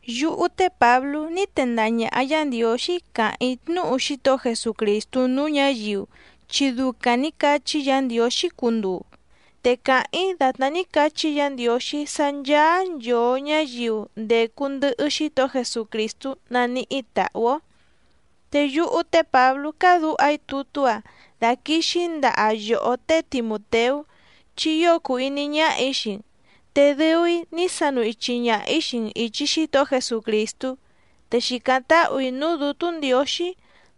Yúhú té Pǎblú ní tendaha ñàha Yá Ndiǒxí càháⁿ‑í tnúhu Xítohó Jesucrìstú núú ñǎyiu, chi ducaⁿ nǐ cachí Yǎ Ndiǒxí cunduu. Te càháⁿ‑í dàtná ní cachí Yǎ Ndiǒxí sá ncháá nchòo ñáyiu ndècu ndɨhɨ Xítohó Jesucrìstú naníhí tàhú‑ó. Te yúhú té Pǎblú cádǔha‑í tutú‑a daquìxi‑í ndaha yòhó té Timùteú chi ío cùu iní ñáhà‑í xii‑n, te dɨu‑í ní sanu ichi ñaha‑ǐ xii‑n ìchi Xítohó Jesucrìstú, te xìcáⁿ táhù‑í núú Dǔtú Ndiǒxí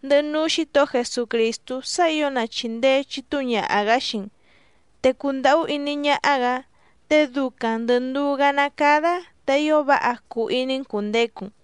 ndɨhɨ núú Xǐtohó Jesucrìstú sá ǐo na chìndee chitúu ñaha‑gǎ xii‑n, te cundàhú iní ñáhá‑gǎ, te ducaⁿ ndɨ̀ nduú‑gá ná cádá te ío váha cuu iní‑n cùndecu‑n.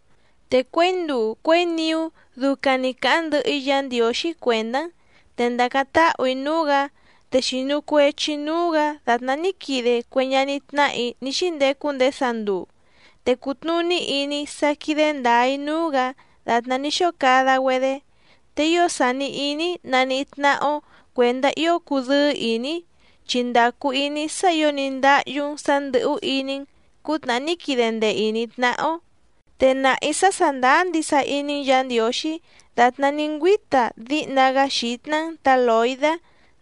Te cuěi nduu cuěi niú ducaⁿ‑ni càháⁿ ndɨhɨ‑í Yǎ Ndiǒxí cuèndá‑n, te ndàcáⁿ táhù‑í núú‑gǎ, te xìnu cuechi‑í núú‑gǎ dàtná ní quide cue ñaní tnáhà‑í ní xíndecu ndéé sanduu, te cùtnuní iní‑í sá quídé ndǎá‑í núú‑gǎ dàtná ní xóo cada‑güedé. Te ío sàni iní‑í naníhí tnáhá‑ó cuèndá ío cudɨ́ɨ́ ìní‑í, chi ndàcu iní‑í sá ǐo ní ndáhyú‑n sǎ ndɨ̀hú iní‑n cǔtnàhá ní quide ndee ìní‑í tnáhá‑ó. Te nàha‑í sá sàndáá ndisa iní‑n Yǎ Ndiǒxí dàtná ní ngüíta díhna‑gá xǐtná‑n tǎ Lòidá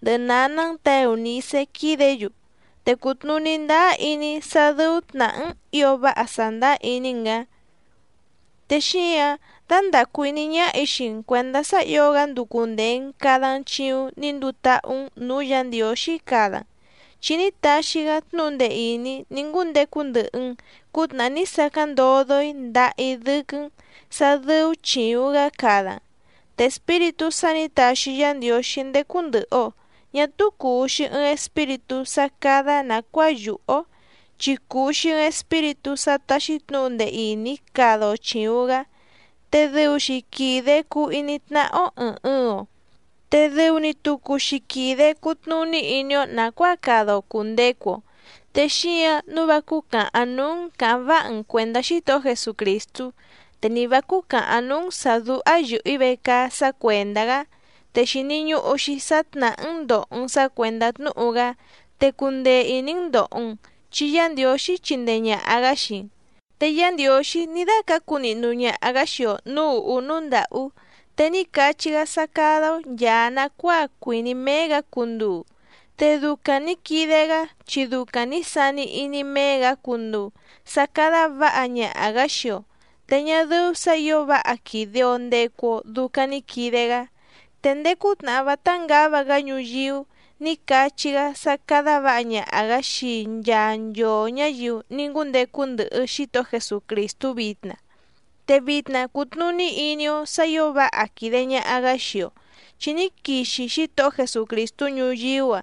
ndɨhɨ nǎná‑n tǎ Eùnicé quídě‑yu, te cùtnuní ndáá iní‑í sá dɨ́ú tnàhá‑n ǐo váha sàndáá iní‑n‑gǎ. Te xíǎⁿ dándàcu iní ñáhà‑í xii‑n cuèndá sá ǐo‑gá nducu ndèe‑n cada‑n chiuⁿ ní nduu táhú‑n nǔú Yǎ Ndiǒxí cada‑n, chi ní taxi‑gá tnúhu ndee ìní ní ngúndecu ndɨhɨ‑n cǔtnàhá ní sacáⁿ ndodo‑í ndaha‑í dɨ́quɨ́‑n sǎ dɨ́ú chìuⁿ‑gá cada‑n. Te Espíritú sá nǐ taxi Yá Ndiǒxí ndécú ndɨ̀hɨ‑o ñá túú cùu‑xi ɨɨⁿ Espíritú sá cádá nàcuáa yùhú‑ó, chi cùu‑xi ɨɨⁿ Espíritú sá táxí tnǔhu ndee ìní cada‑o chìuⁿ‑gá, te dɨu‑xi quìde cuu iní tnáhá‑ó ɨ̀ɨⁿ ɨɨⁿ‑o, te dɨu‑ni tucu‑xi quìde cutnuní iní‑ó nàcuáa cada‑o cùndecu‑o. Te xíǎⁿ nǔu vá cúcàhaⁿ núú‑n cǎháⁿ váha‑n cuèndá Xítohó Jesucrìstú, te ni vǎ cúcàhaⁿ núú‑n sǎ dúhá yɨ̀hɨ‑í vecaá sá cuèndá‑gá, te xìni ñuhu‑xi sá tnàhá‑n ndòho‑n sá cuèndá tnúhu‑gá, te cundee ìní‑n ndòho‑n, chi Yá Ndiǒxí chindee ñàha‑gá xii‑n. Te Yá Ndiǒxí ní dácǎcu nihnu ñaha‑gǎ xii‑o nǔú ùhú núú ndàhú, te ní cachí‑gá sá cádá‑ó nchàa nacuáa cuìní méé‑gǎ cunduu, te ducaⁿ nǐ quide‑gá chi ducaⁿ nǐ sani iní méé‑gǎ cunduu sá cádá vǎha ñaha‑gǎ xii‑o, te ñá dɨ́ú sǎ ǐo váha quìde‑o ndecu‑o ducaⁿ ni quide‑gá. Te ndéé cútnàhá vátá ngǎva‑gá ñuyíú nǐ cachí‑gá sá cádá vǎha ñaha‑gǎ xii nchaa nchoo ñǎyiu ní ngúndecu ndɨhɨ Xítohó Jesucrìstú vitna. Te vitna cùtnuní iní‑ó sǎ ǐo váha quìde ñaha‑gá xii‑o, chi ní quixi Xítohó Jesucrìstú ñuyíú‑a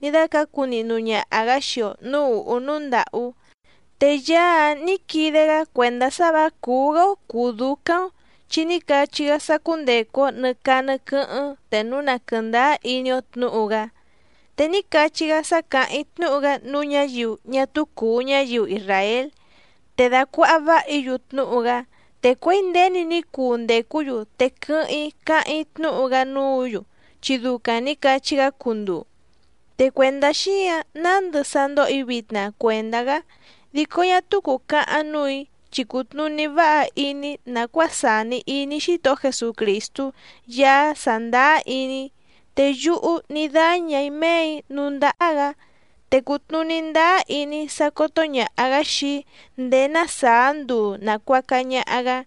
ní dácǎcu nihnu ñaha‑gǎ xii‑o nǔú ùhú núú ndàhú, te Yaá‑áⁿ nǐ quide‑gá cuèndá sá vǎ cùú‑gá‑ó cùú dúcáⁿ‑ó, chi ní cachí‑gá sá cúndècu‑o nɨ caa nɨ quɨ́hɨ́ⁿ te núu na quɨ̀ndáá iní‑ó tnǔhu‑gá. Te ní cachí‑gá sá càháⁿ‑í tnúhu‑gá núú ñǎyiu ñá túú cùu ñáyiu isràél te dacuàha váha‑í‑yu tnúhu‑gá, te cuěi nděni ní cuu ndècú‑yu te quɨ́hɨ́ⁿ‑í cáháⁿ‑í tnúhu‑gá núǔ‑yu chi ducaⁿ nǐ cachí‑gá cunduu. Te cuèndá xíǎⁿ nándɨ sá ndóhò‑í vitna cuèndá‑gá, dico ñá túú cùcahaⁿ núù‑í chi cùtnuní váha iní‑í nàcuáa sàni iní Xítohó Jesucrìstú Yaá sàndáá iní‑í, te yúhú ní dáñà‑í méè‑í núú ndáhá‑gǎ, te cùtnuní ndáá iní‑í sá cótó ñàha‑gá xii‑í ndéé ná sàá nduu nàcuaca ñaha‑gá.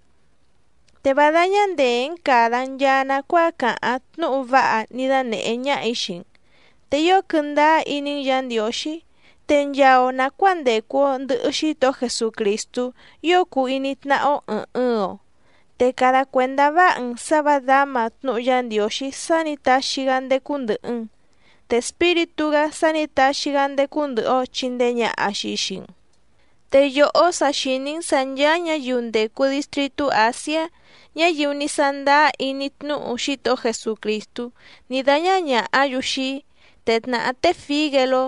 Te vá dáñá ndèé‑n càda‑n nchaa nacuáa càháⁿ tnúhu váha ní dánèhé ñáhà‑í xii‑n, te ío quɨndáá iní‑n Yǎ Ndiǒxí, te nchaa‑o nàcuáa ndècu‑o ndɨhɨ Xítohó Jesucrìstú ío cuu iní tnáhá‑ó ɨ̀ɨⁿ ɨɨⁿ‑o. Te cada cuèndá váha‑n sǎ vǎ dǎma tnúhu Yá Ndiǒxí sá nǐ taxi‑gá ndécú ndɨ̀hɨ‑n, te Espíritú‑gá sá nǐ taxi‑gá ndécú ndɨ̀hɨ‑o chindee ñaha‑xi xii‑n. Te yòhó sa xìní‑n sǎ nchàa ñáyiu ndècu distritú Àsiá, ñáyiu ní sándáá iní tnúhu Xítohó Jesucrìstú ní dáñá ñàhá‑yu xii‑í, te tnàhá té Fígeló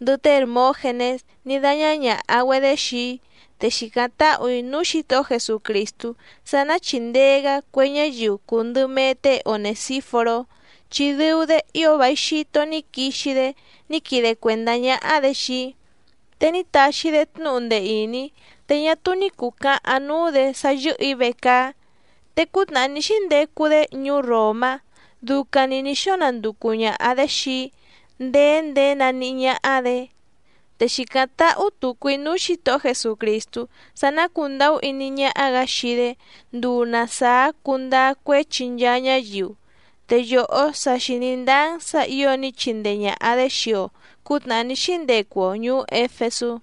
ndɨhɨ té Hèrmógenés ní dáñá ñàha‑güedé xii‑í. Te xìcáⁿ táhù‑í núú Xǐtohó Jesucrìstú sá ná chìndee‑gá cue ñáyiu cùu ndɨ mee té Onèsíforó, chi dɨu‑dé ío vài xito ní quixi‑dé ní quide cuèndá ñáhá‑dě xii‑í, te ní taxi‑dé tnúhu ndee ìní, te ñá túú ní cùcahaⁿ núú‑dě sá yɨ́hɨ̀‑í vecaá. Te cútnàhá ní xíndecu‑dé ñuú Ròmá ducaⁿ‑ni nǐ xóo nanducu ñàha‑dé xii‑í ndèé ndéé naníhí ñáhá‑dě. Te xìcáⁿ táhú tùcu‑í núú Xǐtohó Jesucrìstú sá ná cùndahú iní ñáhá‑gǎ xii‑dé nduu na sàá cundáá cuéchi nchaa ñáyiu. Te yòhó sa xìní ndáá‑n sǎ ǐo ní chindee ñàha‑dé xii‑o cǔtnàhá ní xíndecu‑o ñùú Éfesú.